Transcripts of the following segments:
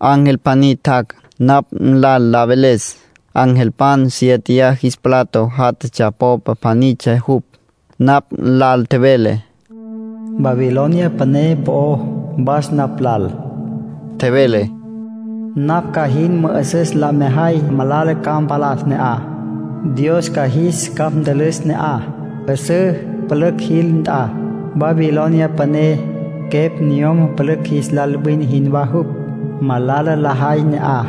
Ángel pjaní tjac', napj nlal la veles. Angelpan siéteya jis plato jatatsja popa pjanitsja jupj. Napj nlal tjevele “Babilonia Püné” po'ó. “Was napj lal —tjevele—. Napj ca jin mü'üsüs la mejay malala ca mpalas ne'aj. Dios ca jis capj ntülüs ne'aj, 'üsǘ pülücj jil nt'a. Babilonia Püné, quepj niyom pülücj jis lal wine jinwá jupj. Malala lajay ne'aj.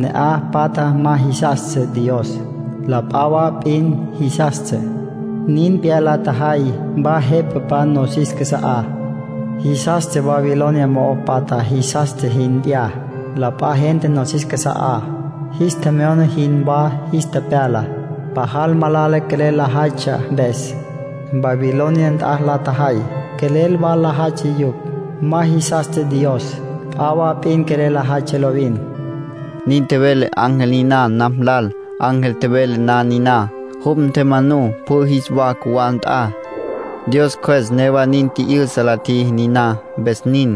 Ne'aj patja ma jisastsja Dios; la p'a wa p'in jisastsja. Nin p'iyá la tjajay wa jepapan nosis casa'á. Jisastsja wa Babilonia mo'o patja jisastsja jin p'iyá. La p'a gente nosis casa'á, jis tjemyona jinwá jis tepyala, pajal malala quelel lajaytsja mpes. Babilonia nt'a la tjajay, quelel wa lajaytsja yupj. Ma jisastsja Dios. P'a wa p'in quelel lajaytsja lovin.” Nin tjevele ángel niná napj lal. Ángel tjevele na niná, jupj ntjemanú pjü jis wa cjuwá nt'a. Dios Cjües newa nin tji'yüsa la tjiji niná, mpes nin.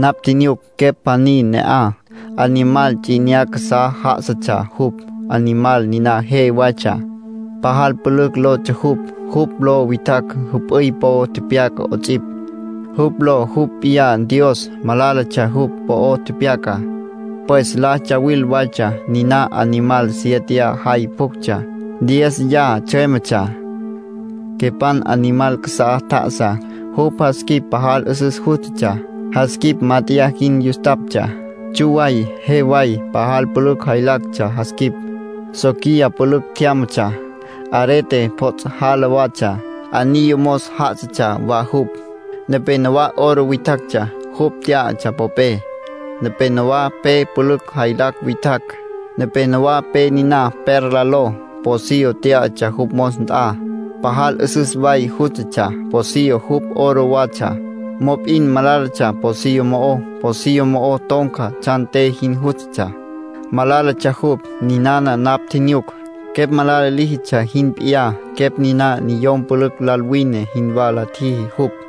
Napj tjinyuc quepj pjaní ne'aj. Animal ts'i 'inyá casá já'asatsja jupj. Animal niná je waytsja, pajal pülücj lotsja jupj. Jupj ló witjacj jüp'üy po'o tepyaca 'ots'ipj. Jupj ló jupj p'iyá Dios; malálatsja jupj po'o tepyacá, pues la tsuwil waytsja. Niná animal siéteya jay pjuctsja, diéziya tsjüémetsja. Quepan animal casá tja'asá, jupj jas quip pajal 'üsüs jústatsja. Jas quip mát'eya jin yustaptsja, tsju way, je way. Pajal pülücj jaylactsja jas quip. Soquiya pülücj tjyámatsja, arete pjots' jala watsja, anillo mos já'asatsja wa jupj. Nepénowa oro witjactsja, jupj tyá'atsja popé, nepénowa pe pülücj jaylacj witjacj, nepénowa pe niná perla ló. Pocillo tyá'atsja jupj mos nt'a, pajal 'üsüs way jústatsja. Pocillo, jupj oro watsja. Mop'in malálatsja pocillo mo'ó. Pocillo mo'o ton̈ca tsjan te jin jústatsja, malálatsja jupj. Ninana napj tjinyuc, quepj malala líjitsja jin p'iyá. Quepj niná niyom pülücj lal wine jinwá la tjiji jupj.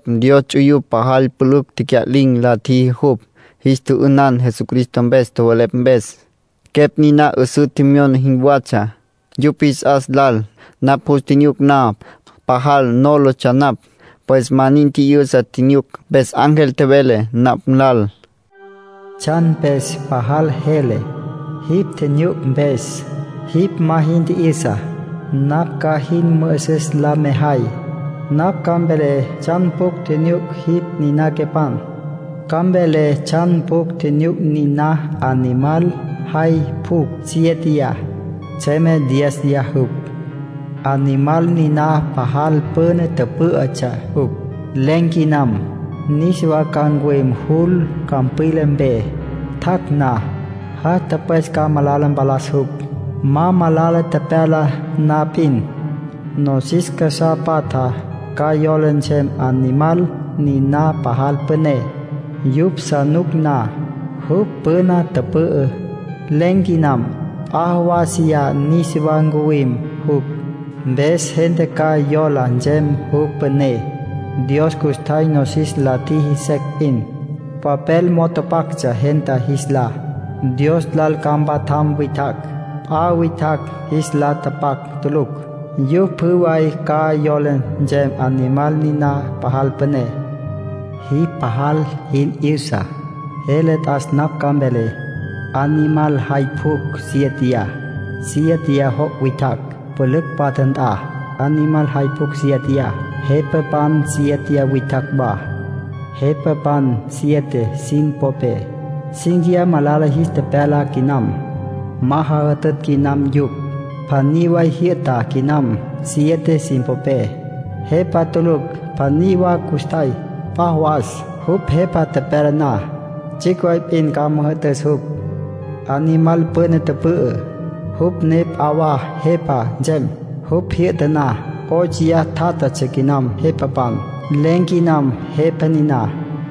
Niná quepan, Dios ts'uyupj pajal pülücj tecya'lin̈ la tjiji jupj. Jis tjü'ünan Jesucristo mpes tjowelepj mpes. Quepj niná 'üsǘ tjemyona jinwatsja, yupj jis 'as lal. Napj jus tjinyuc na, pajal nólatsja napj, pues ma nin tji'yüsa tjinyuc. Mpes ángel tjevele napj lal: “¿Tsjan mpes pajal jele, jipj tjinyuc mpes? Jipj ma jin tji'yüsá, napj ca jin mü'üsüs la mejay. Napj ca mvelé tsjan pjucj tjinyuc jipj niná quepan. Ca mvelé tsjan pjucj tjinyuc niná animal jay pjucj sieteyá, tsjüeme dieziyá jupj. Animal niná pajal püna tüpǘ'ütsja jupj, len̈ quinam. Niswa ca ncuwim jul campwila mpe. Tjac' na, jas tüpwes ca malala mpalas jupj. Ma malala tepyala na p'in, nosis casá patja ca yola nsem animal niná pajal püné, yupj sa nuc na. Jupj püna tüpü'ü. Len̈ quinam; p'a jawásiya niswa ncuwim jupj, mpes gente ca yola nsem jupj püné. Dios custjay nosis la tjiji secj p'in, papel mo'o tapactsja gente jis lá, Dios lal ca mpatjam witjacj. P'a witjacj jis lá tapac tulucj; yupj pjü way ca yola nsem animal niná pajal püné. ”Jipj pajal jin 'yüsa, jele t'as napj ca mvelé. Animal jay pjucj sieteyá, siéteya joc' witjacj, pülücj patja nt'a. Animal jay pjucj sieteyá, jepapan siéteya witjacj wa. Jepapan siete sin popé, cínquiya malala jis tepyala quinam, ma jajütütj quinam yupj. Pjaní way jyü'ta quinam siete sin popé. Jepa tulucj pjaní wa custjay. P'a jawas, jupj jepa tepyala na, tsjicj way p'in ca müjü'tüs jupj. Animal püna tüpü'ü, jupj ne p'a wa jepa nsem. Jupj jyü'ta na, óchoya tjátjatsja quinam jepapan. Len̈ quinam jepa niná.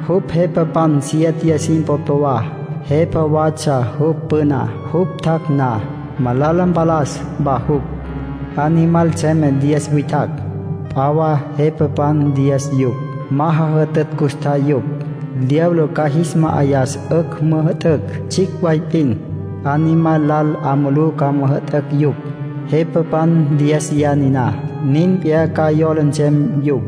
Jupj jepapan siéteya sin popé wa; jepa watsja jupj püná. Jupj tjac' na, malala mpalas wa jupj. ”Animal tsjüeme diez witjacj, p'a wa jepapan diez yupj. Ma jajütütj custjay yupj; diablo ca jis ma'ayas 'ücj müjü'tücj tsjicj way p'in. Animal lal 'a mulú ca müjü'tücj yupj. Jepapan diéziya niná, nin p'iyá ca yola nsem yupj.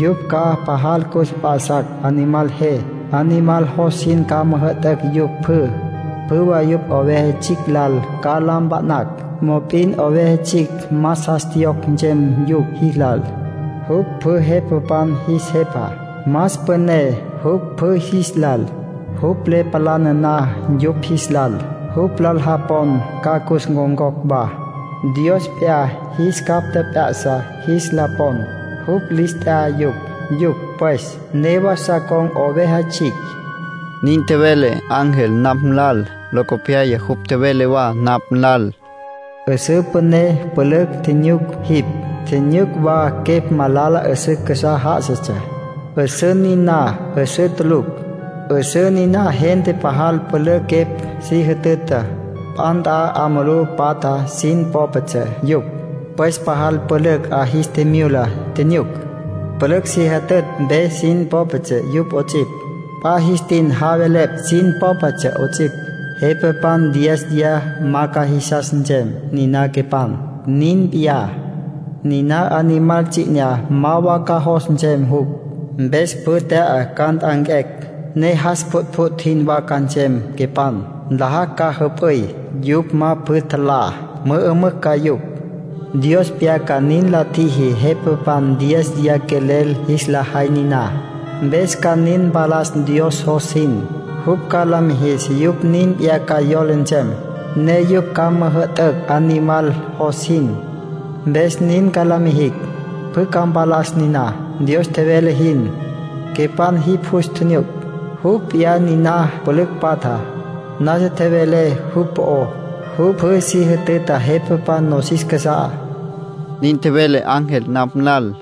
Yupj ca pajal cus mp'a'sacj animal je. Animal jos jin ca müjü'tücj yupj pjü. Pjü way yupj Oveja Tsjicj lal ca la mpa'nacj. Mop'in Oveja Tsjicj más jas tjiyocj nsem yupj jis lal. Jupj pjü jepapan jis Jepa, más püné jupj pjü jis lal. Jupj le palana na yupj jis lal, jupj lal japon ca cus ncon̈cocj wa. Dios p'iyá jis capj tjep'ya'sa jis la pon. Jupj lis t'ya yupj. Yupj, pues, newa sa con̈ Oveja Tsjicj”, nin tjevele ángel napj lal. Locopyaya jupj tjevele wa napj lal: “'Üsǘ püné pülücj tjinyuc jipj, tjinyuc wa quepj malala 'üsǘ casá já'asatsja. 'Üsǘ niná 'üsǘ tulucj. 'Üsǘ niná gente pajal pülücj quepj si jütüta. P'a nt'a 'a mulú patja sin popetsja yupj. Pues pajal pülücj 'a jis tjimyula tjinyuc. Pülücj se jütütj mpe sin popetsja yupj 'ots'ipj. P'a jis tin javelepj sin popetsja 'ots'ipj. Jepapan diéziya ma ca jisas nsem niná quepan. Nin p'iyá, niná animal ts'i 'inyá ma wa ca jos nsem jupj. Mpes pjü tya'a ca nt'anquecj, ne jas pjütpjüt' jinwá ca nsem quepan. Nlajacj ca jüp'üy. Yupj ma pjü tjalá, mü'ümücj ca yupj. Dios p'iyá nin la tjiji jepapan diéziya quelel jis la jay niná. Mpes ca nin mpalas Dios jos jin. Jupj ca la mijis yupj nin p'iyá ca yola nsem, ne yupj ca müjü'tücj animal jos jin. Mpes nin ca la mijicj. Pjü ca mpalas niná, Dios tjevele jin. Quepan jipj jus tjinyuc, jupj p'iyá niná pülücj patja, nasa tjevelé jupj po'ó. Jupj pjü si jütüta jepapan nosis casa'á”, nin tjevele ángel napj lal.